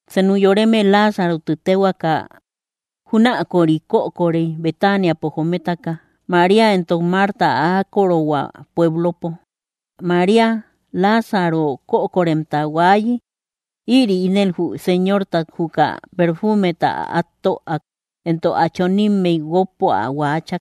Senu yoreme Láazaro ti téhuaka júnaköri kökorey, Betaniapo jometaka, María éntok Marta ä ákorohua pueblopo. María, Láazaro kökoremta huaayi, ïri ínel jü Señortat juka perfuumeta át töak, éntok ä chonimmey guókpo ä huaachak.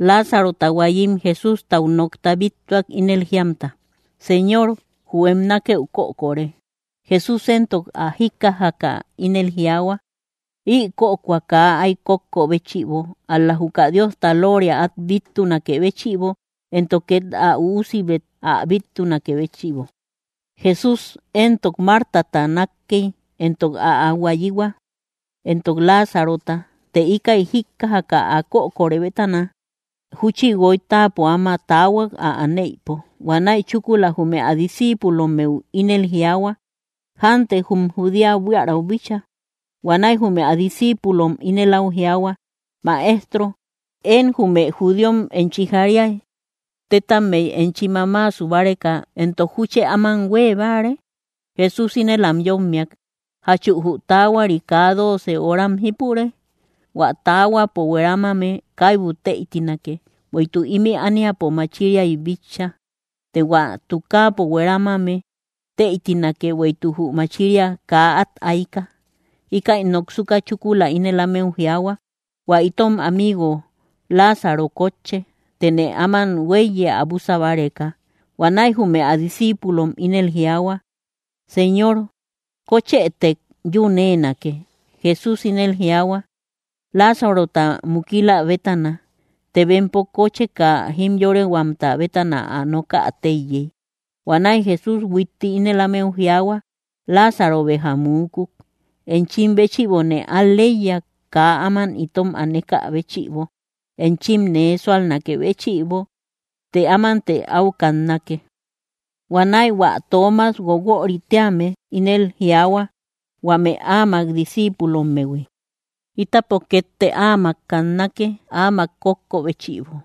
Láazarota huaayim Jesústau nokta bíttuak, ínel jiamta: —Señor, jü em nákëu kökore. Jesús éntok ä jíkkajaka ínel jiaahua: —Ï kökoa kaa áy kókko béchïbo, ál‑la juka Diosta looria át bíttunakë béchïbo, éntok két ä Üusibet ä bíttunakë béchïbo. Jesús éntok Martata nákkey, éntok ä huayihua, éntok Láazarota. Të íkäi jíkkajaka, ä kökorë bétana, júchi guoy táapo áma taahuak, ä aneïpo. Huanäi chúkula jume ä discíipulommeu ínel jiaahua: —Jánte jum Judea buiärau bíchaa. Huanäi jume ä discíipulom ínel áu jiaahua: —Maestro, én jume judíom enchi jariay, tetammey enchi mamaasu báreka. Entok, ¿júchë áman huée báare? Jesús ínel am yómmiak: —¿Jachu jü taahuari kaa dooce horam jípure? Huä taahuapo hueramame kaibu tëitinake, bueïtuk ímï ániapo machiriay bitcha; të hua tukaapo hueramame tëitinake, bueïtuk jü machiria kaa át aika. Íkäi noksuka, chúkula ínel ámeu jiaahua: —Huä itom amigo Láazaro kótche; tëne áman huéiye ä búsa báreka. Huanäi jume ä discíipulom ínel jiaahua: —Señor, kóchëtek, yún éenake. Jesús ínel jiaahua, Láazarota mukila bétana. Të bempo kócheka jimyorehuamta bétana ä nokä téiyey. Huanäi Jesús huitti ínel ámeu jiaahua: —Láazaro béja muukuk. Enchim béchïbone al‑leiya, kaa áman itom anekä béchïbo, enchim nee súalnakë béchïbo. Të ámante áu kannake. Huanäi hua Toomas, Guoguörï téame, ínel jiaahua huame áamak discíipulommehui: —Ítapo kétte áamak kannake, áamak kókko béchïbo.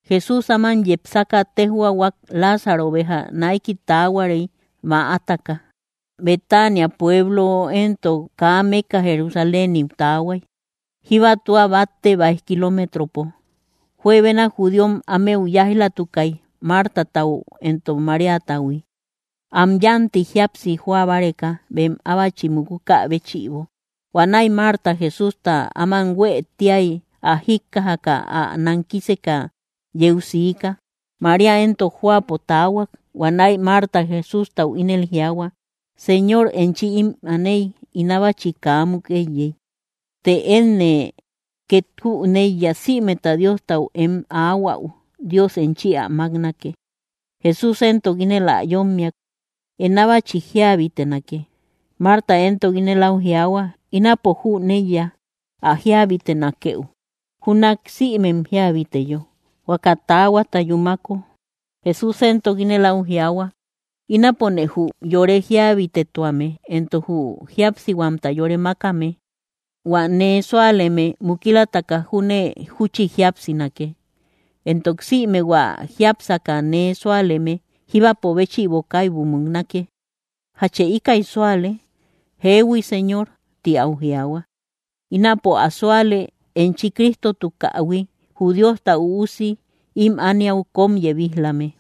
Jesús áman yepsaka tejhuahuak: Láazaro béja naiki taahuarey, mäataka. Betania pueblo éntok kaa mékka Jerusaléniu taahuay, jíba tua batte báij kiloometropo. Juebena judíom ámeu yáij‑latukay Martatau éntok Maríatahui, am yánti jíapsi joa báreka, bem ábachi mukukä béchïbo. Huanäi Marta Jesústa áman huë tíay ä jíkkajaka, ä nankiseka yeu siika; María éntok jóapo taahuak. Huanäi Marta Jesústau ínel jiaahua: —Señor, enchi ím aney ín ábachi kaa muk éiyey. Të énne két jüneiya, sïmeta Diostau em aahuäu, Dios enchi ä máknake. Jesús éntok ínel ä yómmiak: —Em ábachi jíabitenake. Marta éntok ínel áu jiaahua: —Ínapo jüneiya ä jíabitenakëu júnak sïmem jíabiteyo, huaka taahuata yúmako. Jesús éntok ínel áu jiaahua: —Ínapone jü yore jíabitetuame éntok jü jíapsihuamta yore mákame. Huä nee súaleme mukilataka júne júchi jíapsinake. Éntok sïme hua jiápsaka nee súaleme jíbapo béchïbo kaibu muknake. ¿Jachë íkäi súale? —Jeehui, Señor —ti áu jiaahua—. Ínapo ä súale, enchi Cristotukähui, jü Diosta Üusi ím ániau kóm yebij‑lame.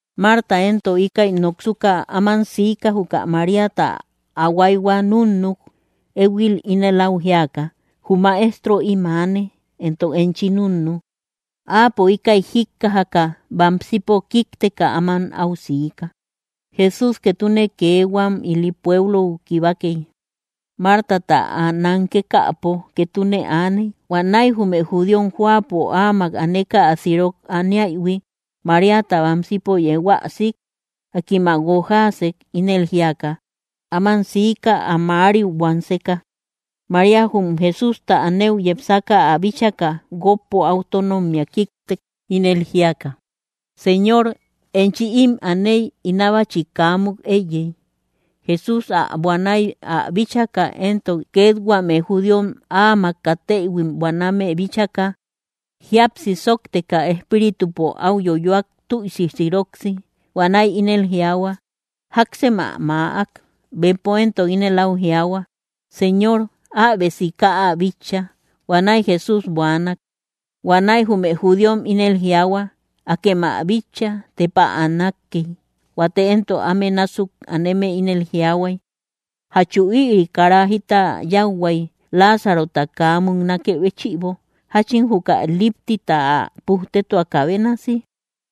Marta éntok íkäi noksuka áman sika, juka Maríata ä huayhua núnnuk, éhuil ínel áu jíaka: —Jü Maestro ím aane; entok enchi núnnu. Áapo íkäi jíkkajaka, bamsipo kíkteka áman áu siika. Jesús ketune kee huam ili pueblou kibakey, Martata ä nankekäpo ketune aaney. Huanäi jume judíom jóapo áamak aneka ä sirok aniaïhui, Maríata bamsipo yeu ä sik, akim ä guojaasek, ínel jíaka: “Áman siika, ä mäariu buanseka.” María jum Jesústa anëu yepsaka, ä bíchaka, guókpo áu tónommea kíktek, ínel jíaka: —Señor, enchi ím aney, ín ábachi kaa muk éiyey. Jesús ä buanay ä bíchaka, éntok két huame judíom áamak kateïhuim buaname bíchaka, jíapsi sóokteka espíritupo áu yoyoak, tüisi siroksi. Huanäi ínel jiaahua: —¿Jáksem ä maäak? Bempo éntok ínel áu jiaahua: —Señor, äbe sika ä bitcha. Huanäi Jesús buaanak. Huanäi jume judíom ínel jiaahua: —¡Akem ä bitcha, tepa ä nákkey! Huate éntok áme násuk aneme ínel jiaahuay: —¿Jachu ïri kara jita yáuhuai, Láazarota kaa múknakë béchïbo, jáchin juka líptita ä pujtetuakä bénasi?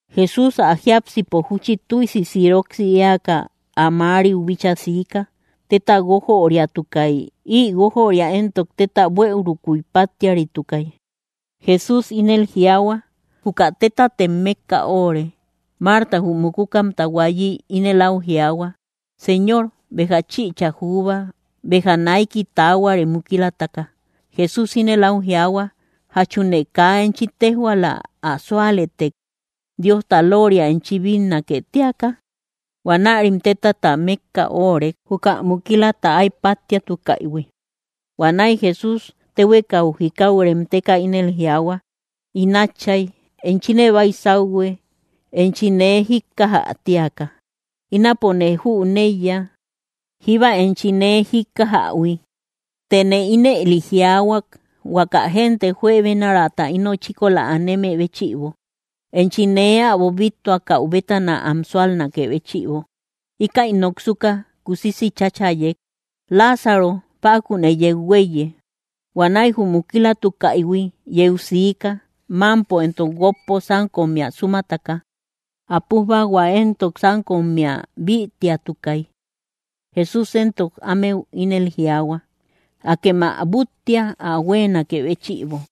Jesús, ä jiápsipo júchi tüisi siroksi éaka, ä mäariu bíchaa siika. Téta guójöriatukay; ï guójöria éntok téta buëurukuy páttiaritukay. Jesús ínel jiaahua: —Juka tétatem mékka oóre. Marta, jü mukukamta huaayi, ínel áu jiaahua: —Señor, béja chïcha juuba, béja naiki taahuare mukilataka. Jesús ínel áu jiaahua: —¿Jachune kaa enchi téjhuaala, ä súalëtek, Diosta looria enchi bínnake tíaka? Huanärim tétata mékka oórek, juka mukilata áy páttiatukaïhui. Huanäi Jesús, téhuekau jikau remteka, ínel jiaahua: —In Átchay, enchine baysauhue enchi nee jíkkajä tíaka. Ínapone jüneiya, jíba enchi nee jijikkajähui; tëne ínëli jiaahuak huaka génte juebenaraata ino chíkola aneme béchïbo, enchi nee äbo bíttuakäu bétana am súalnakë béchïbo. Íkäi noksuka, kusisi cháchayek: —Láazaro, ¡pakunë yeu huéiye! Huanäi jü mukilatukäihui yeu siika, mámpo éntok guókpo sánkommea súmataka. Ä pújbahua éntok sánkommea bïtiatukay. Jesús éntok ámeu ínel jiaahua: —Akem ä búttia, ä huéenakë béchïbo.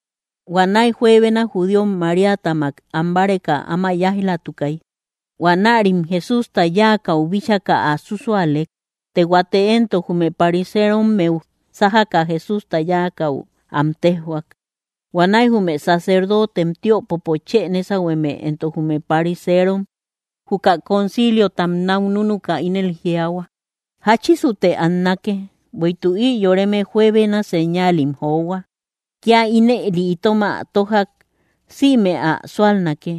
Huanäi juebena judíom Maríatamak ambáreka áma yáij‑latukay. Huanärim Jesústa yáakäu bíchaka ä súsualek. Të huate éntok jume pariserommeu sájaka, Jesústa yáakäu am téjhuak. Huanäi jume sacerdotem tiöpopo chë nésahueme éntok jume pariseerom juka conciliotam náu núnuka, ínel jiaahua: —¿Jáchisute annake? Bueïtuk ï yoreme juebena señaalim johua. Kía ínëli itom ä tójak, sïme ä súsualnake.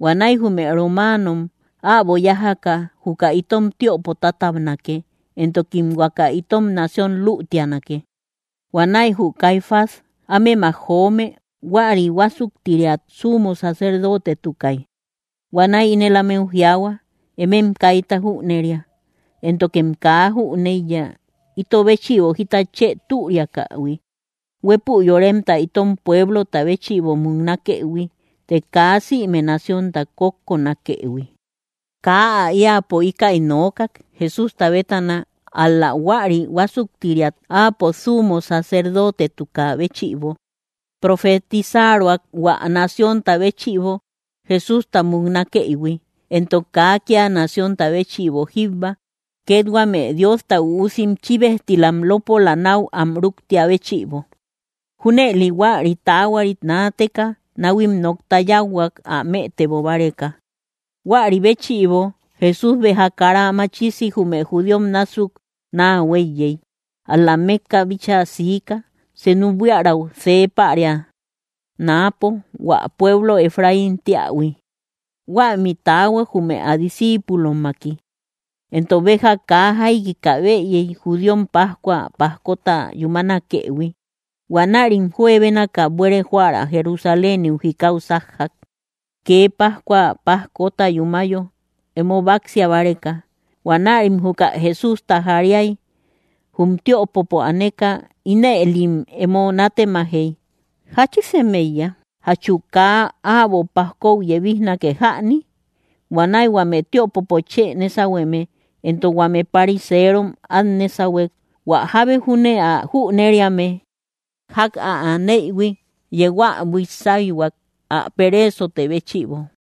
Huanäi jume romaanom äbo yájaka juka itom tiöpo tátabnakë, éntokim huaka itom nación luutianake. Huanäi jü Caifás ámemak joome, huäri huásuktiriat sumo sacerdotetukai, huanäi ínel ámeu jiaahua: —Emem kaita jüneria, éntokem kaa jüneiya, ito béchïbo jita chë türiakähui, huépü yoremta itom pueblota béchïbo muknakëhui, të kaa sïme naciónta kókkonakëhui. Kaa ä éäpo íkäi nookak, Jesústa bétana, ál‑la huäri huásuktiriat áapo sumo sacerdotetukä béchïbo, profetisaruak hua naciónta béchïbo Jesústa muknakëïhui, éntok kaa kía naciónta béchïbo jíbba, két huame Diosta üusim chíbejtilam lópola náu am rúktia béchïbo. Júnëli huäri taahuarit naateka náhuim nokta yáuhuak, ä mëtebo báreka. Huäri béchïbo Jesús béja kara machisi jume judíom násuk naa huéiyey, ál‑la mékka bíchaa siika, senu buiärau see päria, náapo, hua pueblo Efraín téähui. Huämi taahuak, jume ä discíipulommaki. Éntok béja kaa jaikika bëyey, judíom pascua pajkota yúmanakëhui. Huanärim juebénaka buere joära Jerusaléniu jikau sájjak, kee pascua pajkota yúmayo emo báksia báreka. Huanärim juka Jesústa jariay. Jum tiöpopo aneka, ínëlim emo nátemajey: —¿Jáchisem éiya? ¿Jachu kaa äbo pajkou yebijnake jäni? Huanäi huame tiöpopo chë nésahueme éntok huame pariseerom át nésahuek, hua jábe júne ä jüneriame, ják ä anëhui, yeu ä buís sáyhuak, ä pereesote béchïbo.